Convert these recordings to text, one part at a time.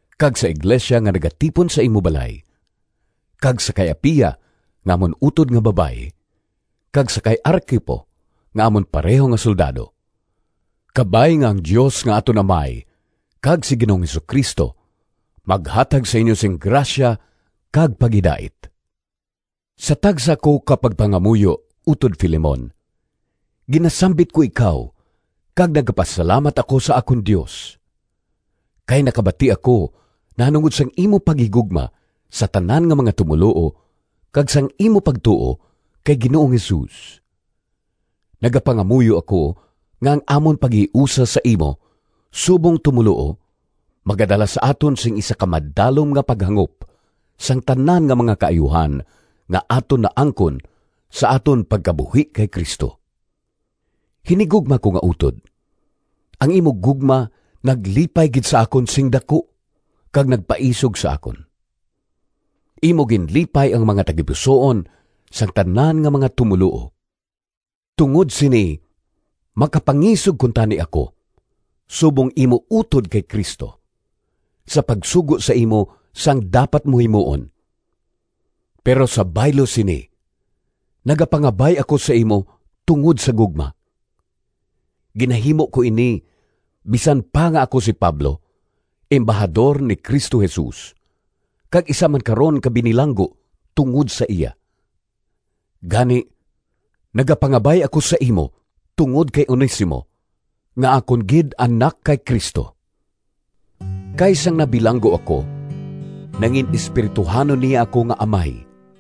kag sa iglesia nga nagatipon sa imo balay, kag sa kay Apia nga amon utod nga babayi kag sa kay Arquipo nga amon pareho nga soldado. Kabay nga ang Dios nga aton Amay kag si Ginoong Jesu-Cristo maghatag sa inyo sing grasya kag paghidait. Sa tagsa ko ka pagpangamuyo, utod Filemon, ginasambit ko ikaw kag nagapasalamat ako sa akon Dios. Kay nakabati ako nahanungod sang imo paghigugma sa tanan nga mga tumoluo kag sang imo pagtuo kay Ginoong Jesus. Nagapangamuyo ako nga ang amon paghiusa sa imo subong tumoluo magadala sa aton sing isa ka madalom nga paghangop sang tanan nga mga kaayuhan nga aton naangkon sa aton pagkabuhi kay Cristo. Hinigugma ko nga utod, ang imo gugma naglipay gid sa akon sing daku kag nagpaisog sa akon! Imo ginlipay ang mga tagipusoon sang tanan nga mga tumoluo. Tungod sini makapangisog kuntani ako, subong imo utod kay Cristo, sa pagsugo sa imo sang dapat mo himuon. Pero sa baylo sini, nagapangabay ako sa imo tungod sa gugma. Ginahimo ko ini bisan pa nga ako si Pablo, embahador ni Cristo Jesus, kag isa man karon ka binilanggo tungod sa iya. Gani nagapangabay ako sa imo tungod kay Onesimo nga akon gid anak kay Cristo. Kay sang nabilanggo ako, nangin-espirituhanon niya ako nga amay.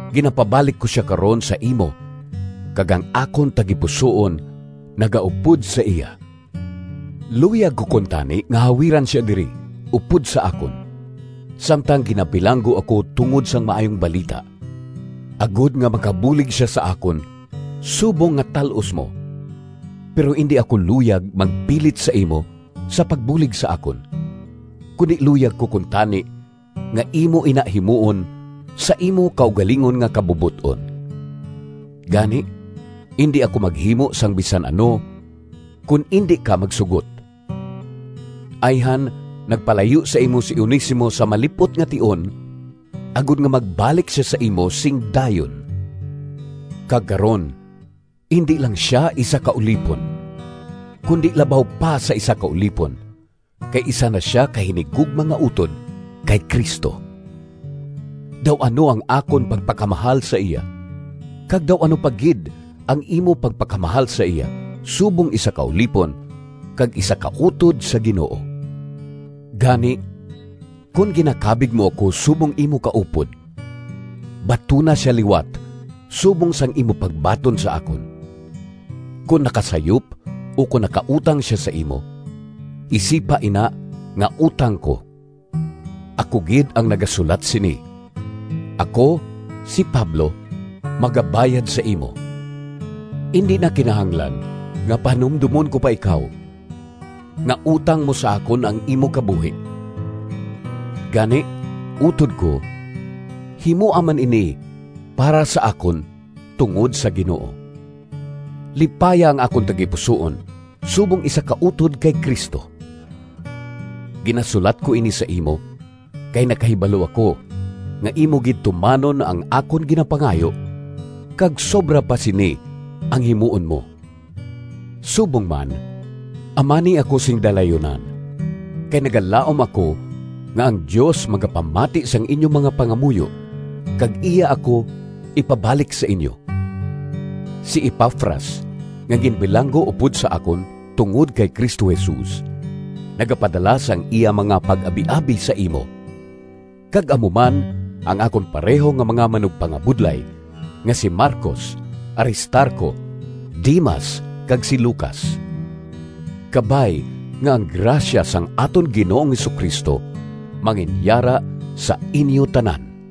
Ginapabalik ko sia karon sa imo kag ang akon tagipusoon nagaupod sa iya. Luyag ko kuntani nga hawiran sia diri upod sa akon, samtang ginabilanggo ako tungod sang Maayong Balita, agod nga makabulig sia sa akon subong nga tal-os mo. Pero indi ako luyag magpilit sa imo sa pagbulig sa akon, kundi luyag ko kuntani nga imo ina himuon sa imo kaugalingon nga kabubot-on. Gani indi ako maghimo sang bisan ano kon indi ka magsugot. Ayhan nagpalayo sa imo si Onesimo sa malip-ot nga tion agod nga magbalik sia sa imo sing dayon. Kag karon indi lang sia isa ka ulipon, kundi labaw pa sa isa ka ulipon kay isa na sia ka hinigugma nga utod kay Cristo. Daw ano ang akon pagpakamahal sa iya! Kag daw ano pa gid ang imo pagpakamahal sa iya, subong isa ka ulipon kag isa ka utod sa Ginoo! Gani, kon ginakabig mo ako subong imo kaupod, batuna sia liwat subong sang imo pagbaton sa akon. Kon nakasayop ukon nakautang sia sa imo, isipa ina nga utang ko. Ako gid ang nagasulat sini: Ako, si Pablo, magabayad sa imo. (Indi na kinahanglan nga pahanumdomon ko pa ikaw, nga utang mo sa akon ang imo kabuhi.) Gani, utod ko, himoa man ini para sa akon tungod sa Ginoo. Lipaya ang akon tagipusoon subong isa ka utod kay Cristo. Ginasulat ko ini sa imo kay nakahibalo ako nga imo gid tumanon ang akon ginapangayo kag sobra pa sini ang himuon mo. Subong man, amani ako sing dalayunan, kay nagalaom ako nga ang Dios magapamati sang inyo mga pangamuyo kag iya ako ipabalik sa inyo. Si Epafras nga ginbilanggo upod sa akon tungod kay Cristo Jesus, nagapadala sang iya mga pag-abiabi sa imo, kag amo man ang akon pareho nga mga manugpangabudlay nga si Marcos, Aristarco, Demas kag si Lucas. Kabay nga ang grasya sang aton Ginoong Jesu-Cristo manginyara sa inyo tanan.